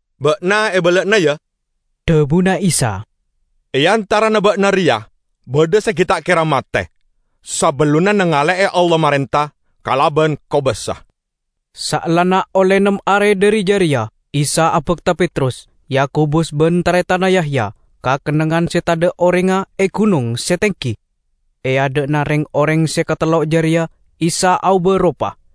"Ba'na ebala'ana, ya!" dhabuna Isa. "E antarana ba'na reya badha se gi' ta' kera mate, sabellunna nangale'e Allah marenta kalaban kobasa!" Saellana olle nem are dhari jareya Isa abakta Petrus, Yakobus ban taretanna Yahya, ka kennengngan se tadha' orengnga e gunong se tenggi. E adha'na reng-oreng se katello jareya Isa aoba ropa.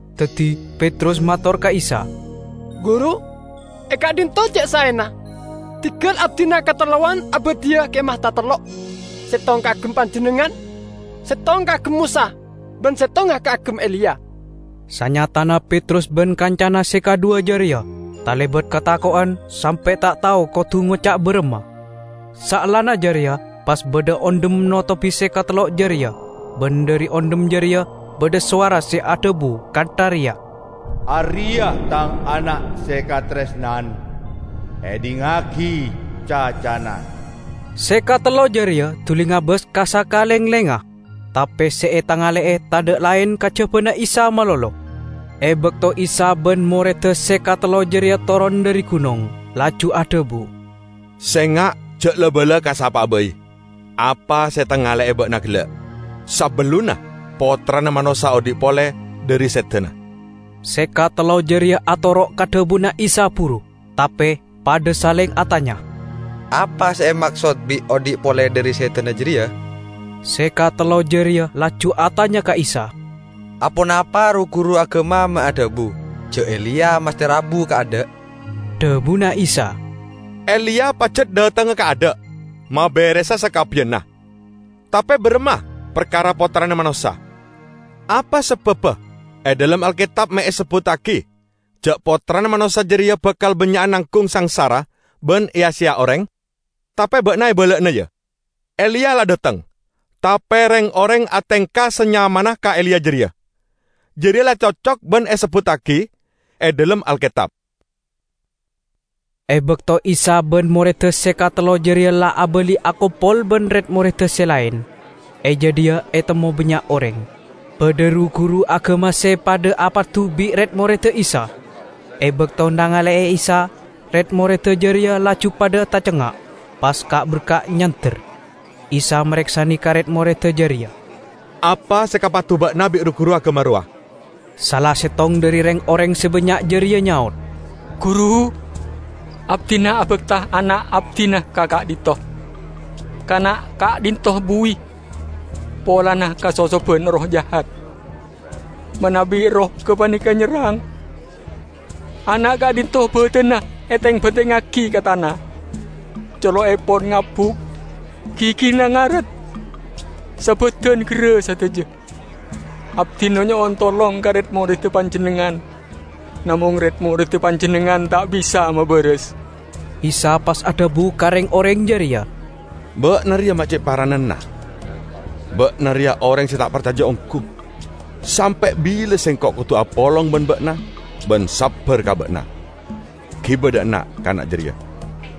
Daddi Petrus mator ka Isa, "Guru, e ka'dhinto' ce' saena. Dinggal abdina katellowan abadhiya kemah tatello': settong kaagem Panjennengngan, settong kaagem Mosa, ban settongnga kaagem Eliya." Sanyatana Petrus ban kancana se kadhuwa jareya talebat katako'en sampe' ta' tao kodu ngoca' baramma. Saellana jareya pas badha ondhem notobi se katello jareya ban dhari ondhem jareya badha sowara se adhabu kantha reya, "Areya' Tang Ana' se kataresnan. Edhingngagi cacana!" Se katello jareya duli ngabas ka sakalenglengnga, tape se etangale'e tadha' laen kajabana Isa malolo. E bakto Isa ban moredda se katello jareya toron dhari gunong, laju adhabu, "Senga' ja' la-bala ka sapa'a bai apa se etangale'e ba'na gella', sabellunna Pottrana Manossa odhi' pole dhari sedana." Se katello jareya atoro' ka dhabuna Isa buru, tape padha saleng atanya, "Apa se emaksod bi' 'odhi' pole dhari sedana' jareya?" Se katello jareya laju atanya ka Isa, "Aponapa ru-guru agama me' adhabu ja' Eliya masthe rabu kaadha'?" Dhabuna Isa, "Eliya pajat dhatengnga kaadha' maberesa sakabbiyanna. Tape baramma parkara Pottrana Manossa? Apa sababba e dhalem Alketab me' esebbuttagi ja' Pottrana Manossa jareya bakal bannya'a nanggung sangsara ban eya-seya oreng? Tape ba'na ebala'ana, ya: Eliya la dhateng, tape reng-oreng atengka sanyamanna ka Eliya jareya. Jareya la cocok ban se esebbuttagi e dhalem Alketab." E bakto Isa ban moredda se katello jareya la abali akompol ban red-moredda se laen, e jadhiya etemmo bannya' oreng. Badha ru-guru agama se padha apadu bi' red-moredda Isa. E bakto nangale'e Isa, red-moredda jareya laju padha tacengnga', pas ka'-berka' nyander. Isa mareksane ka red-moredda jareya, "Apa se ekapadu ba'na bi' ru-guru agama rowa?" Sala settong dhari reng-oreng se bannya' jareya nyaot, "Guru, abdina abakta ana' abdina ka'dhinto'. Kana' ka'dhinto' buwi, polana kasosoban erroh jahat. Manabi erroh gapaneka nyerrang, kana' ka'dhinto' badanna eteng-bantengngagi ka tana, colo'epon ngabuk, gigina ngaret, sabadan gerra sadaja. Abdina nyo'on tolong ka red-moredda Panjennengngan, namong red-moredda Panjennengngan ta' bisa mabaras." Isa pas adhabu ka reng-oreng jareya, "Ba'na reya me' ce' paranana! Ba'na reya oreng se ta' parcaja onggu. Sampe' bila Sengko' kodu apolong ban ba'na ban sabbar ka ba'na? Giba dha' enna' kana jareya!"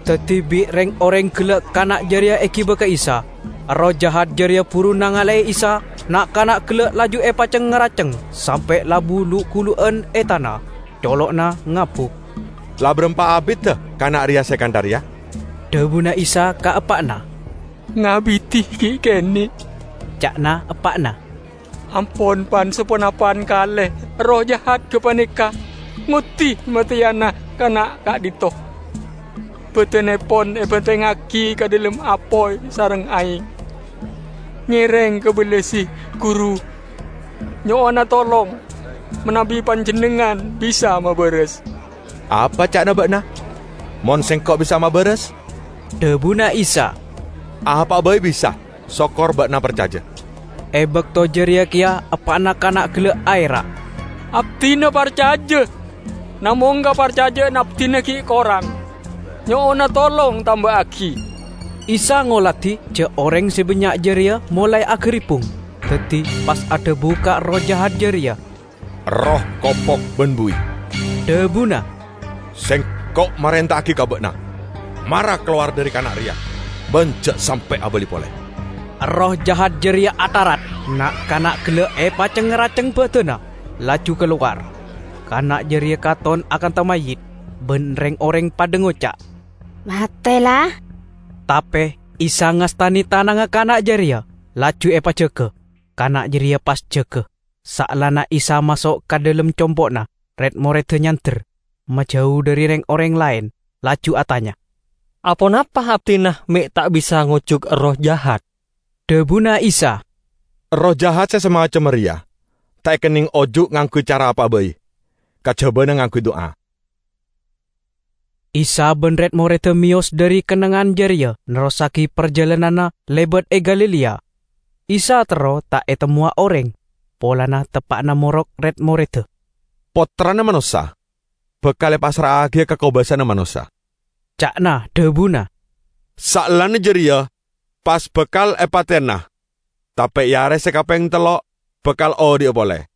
Daddi bi' reng-oreng gella' kana' jareya egiba ka Isa. Erroh jahat jareya buru nangale Isa, na'-kana' gella' laju epaceng-ngaraceng sampe' labu lu'-gulu'an e tana. Colo'na ngabuk. "La barampa abidda kana' reya se kantha reya?" dhabuna Isa ka eppa'na. "Ngabidi gi' kene'," ca'na eppa'na. "Ampon pan-saponapan kale erroh jahat gapaneka ngoddi mateyana kana' ka'dhinto'; badannepon ebantengngagi ka dhalem apoy sareng aeng. Ngereng kabellasi, guru, nyo'ona tolong manabi Panjennengngan bisa mabaras!" "Apa ca'na ba'na? Mon Sengko' bisa mabaras?" dhabuna Isa. "Apa'a bai bisa sokor ba'na parcaja." E bakto jareya keya eppa'na kana' gella' aera', "Abdina parcaja, Namong kaparcaja'an abdina gi' korang. Nyo'ona tolong tamba'agi!" Isa ngoladi ja' oreng se bannya' jareya molae agaribbung, daddi pas adhabu ka erroh jahat jareya, "Erroh kopok ban buwi," dhabuna, "Sengko' marenta'agi ka ba'na, mara kalowar dhari kana' reya, ban ja' sampe' abali pole!" Erroh jahat jareya atharat, na'-kana' gella' epaceng-ngaraceng badanna, laju kalowar. Kana' jareya katon akantha mayyit, ban reng-oreng padha ngoca', "Mate, la." Tape Isa ngastane tanangnga kana' jareya, laju epajaga. Kana' jareya pas jaga. Saellana Isa maso' ka dhalem compo'na, red-moredda nyander, majau dhari reng-oreng laen, laju atanya, "Aponapa abdina me' ta' bisa ngojuk erroh jahat?" Dhabuna Isa, "Erroh jahat se samacemma reya ta' ekenneng ojuk ngangguy cara apa'a bai kajabana ngangguy du'a." Isa ban red-moredda meyos dhari kennengngan jareya nerrossagi parjalananna lebat e Galilea. Isa terro ta' etemmowa oreng, polana teppa'na morok red-moredda. "Pottrana Manossa bakal epassra'agiya ka kobasana manossa," ca'na dhabuna. "Saellana jareya pas bakal epateyana, tape e are se kapeng tello' bakal odhi'a pole."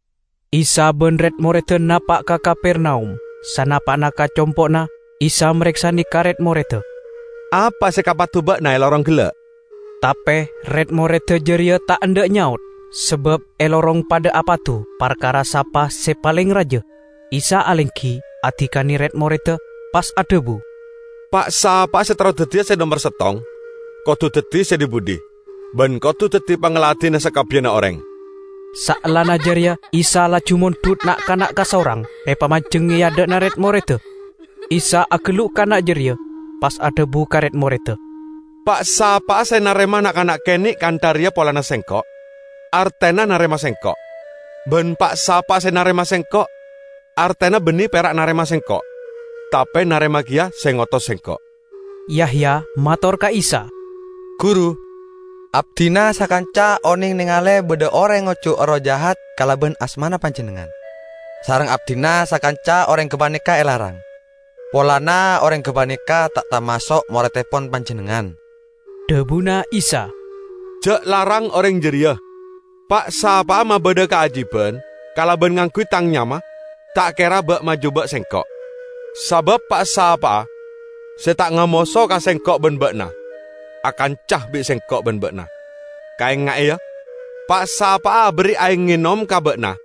Isa ban red-moredda napa' ka Kapernaum. Sanapa'na ka compo'na, Isa mareksane ka red-moredda, "Apa se ekapadu ba'na e lorong gella'?" Tape red-moredda jareya ta' endha' nyaot, sabab e lorong padha apadu parkara sapa se paleng raja. Isa alenggi, adikane red-moredda, pas adhabu, "Pa'-sapa'a se terro daddiya se nomer settong, kodu daddi se dhi-budhi ban kodu daddi pangladinna sakabbiyanna oreng." Saellana jareya Isa laju mondhut na'-kana' kasorang, epamanjeng e adha'na red-moredda. Isa agellu' kana' jareya, pas adhabu ka red-moredda, "Pa'-sapa'a se narema na'-kana' kene' kantha reya polana Sengko', artena narema Sengko'; ban pa'-sapa'a narema Sengko', artena banne pera' narema Sengko', tape narema keya se ngotos Sengko'." Yahya mator ka Isa, "Guru, abdina sakanca oneng nengale badha oreng ngojuk erroh jahat kalaban asmana Panjennengngan. Sareng abdina sakanca oreng gapaneka elarang, polana oreng gapaneka ta' tamaso' morettepon Panjennengngan." Dhabuna Isa, "Ja' larang oreng jareya, pa'-sapa'a mabadha kaajiban kalaban ngangguy Tang nyama, ta' kera ba'-majuba' Sengko'. Sabab pa'-sapa'a se ta' ngamoso ka Sengko' ban ba'na, akanca bi' Sengko' ban ba'na. Kaenga'e, ya! Pa'-sapa'a aberri' aeng enom ka ba'na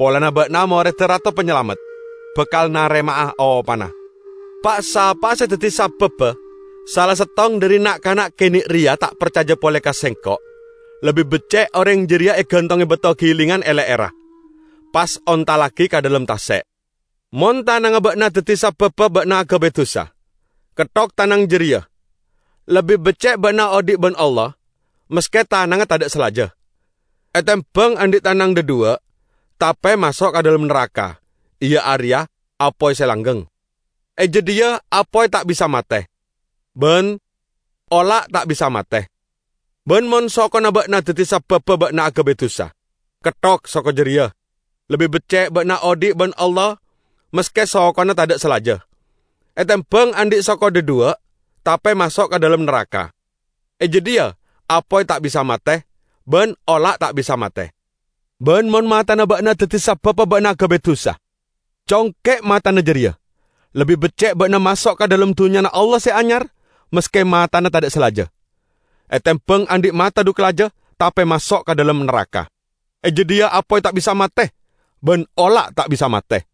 polana ba'na moredda Rato Panyalamet, bakal narema'a opana." "Pa'-sapa'a se daddi sababba sala settong dhari na'-kana' kene' reya ta' parcaja pole ka Sengko', lebbi becce' oreng jareya egantonge bato gilingan e le'erra, pas ontallagi ka dhalem tase'. Mon tanangnga ba'na daddi sababba ba'na agabay dusa, ketthok tanang jareya! Lebbi becce' ba'na odhi' ban Allah maske tanangnga tadha' salaja, etembang andhi' tanang dhadhuwa' tape maso' ka dhalem naraka, iya areya apoy se langgeng. [ E jadhiya apoy ta' bisa mate, ban ola' ta' bisa mate.] Ban mon sokona ba'na daddi sababba ba'na agabay dusa, ketthok soko jareya! Lebbi becce' ba'na odhi' ban Allah maske sokona tadha' salaja, etembang andhi' soko dhadhuwa' tape maso' ka dhalem naraka. [ E jadhiya apoy ta' bisa mate, ban ola' ta' bisa mate.] Ban mon matana ba'na daddi sababba ba'na agabay dusa, congke' matana jareya! Lebbi becce' ba'na maso' ka dhalem Dunnyana Allah Se Anyar maske matana tadha' salaja, etembang andhi' mata dhu kalaja tape maso' ka dhalem naraka. E jadhiya apoy ta' bisa mate, ban ola' ta' bisa mate.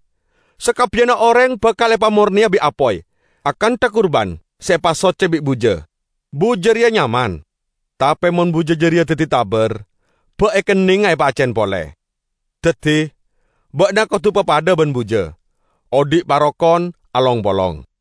Sakabbiyanna oreng bakal epamorneya bi' apoy, akantha kurban se epasocce bi' buja. Buja reya nyaman, tape mon buja jareya daddi tabar, ba' ekennenga epaaccen pole? Daddi, ba'na kodu papadha ban buja, odhi' parokon along-polong."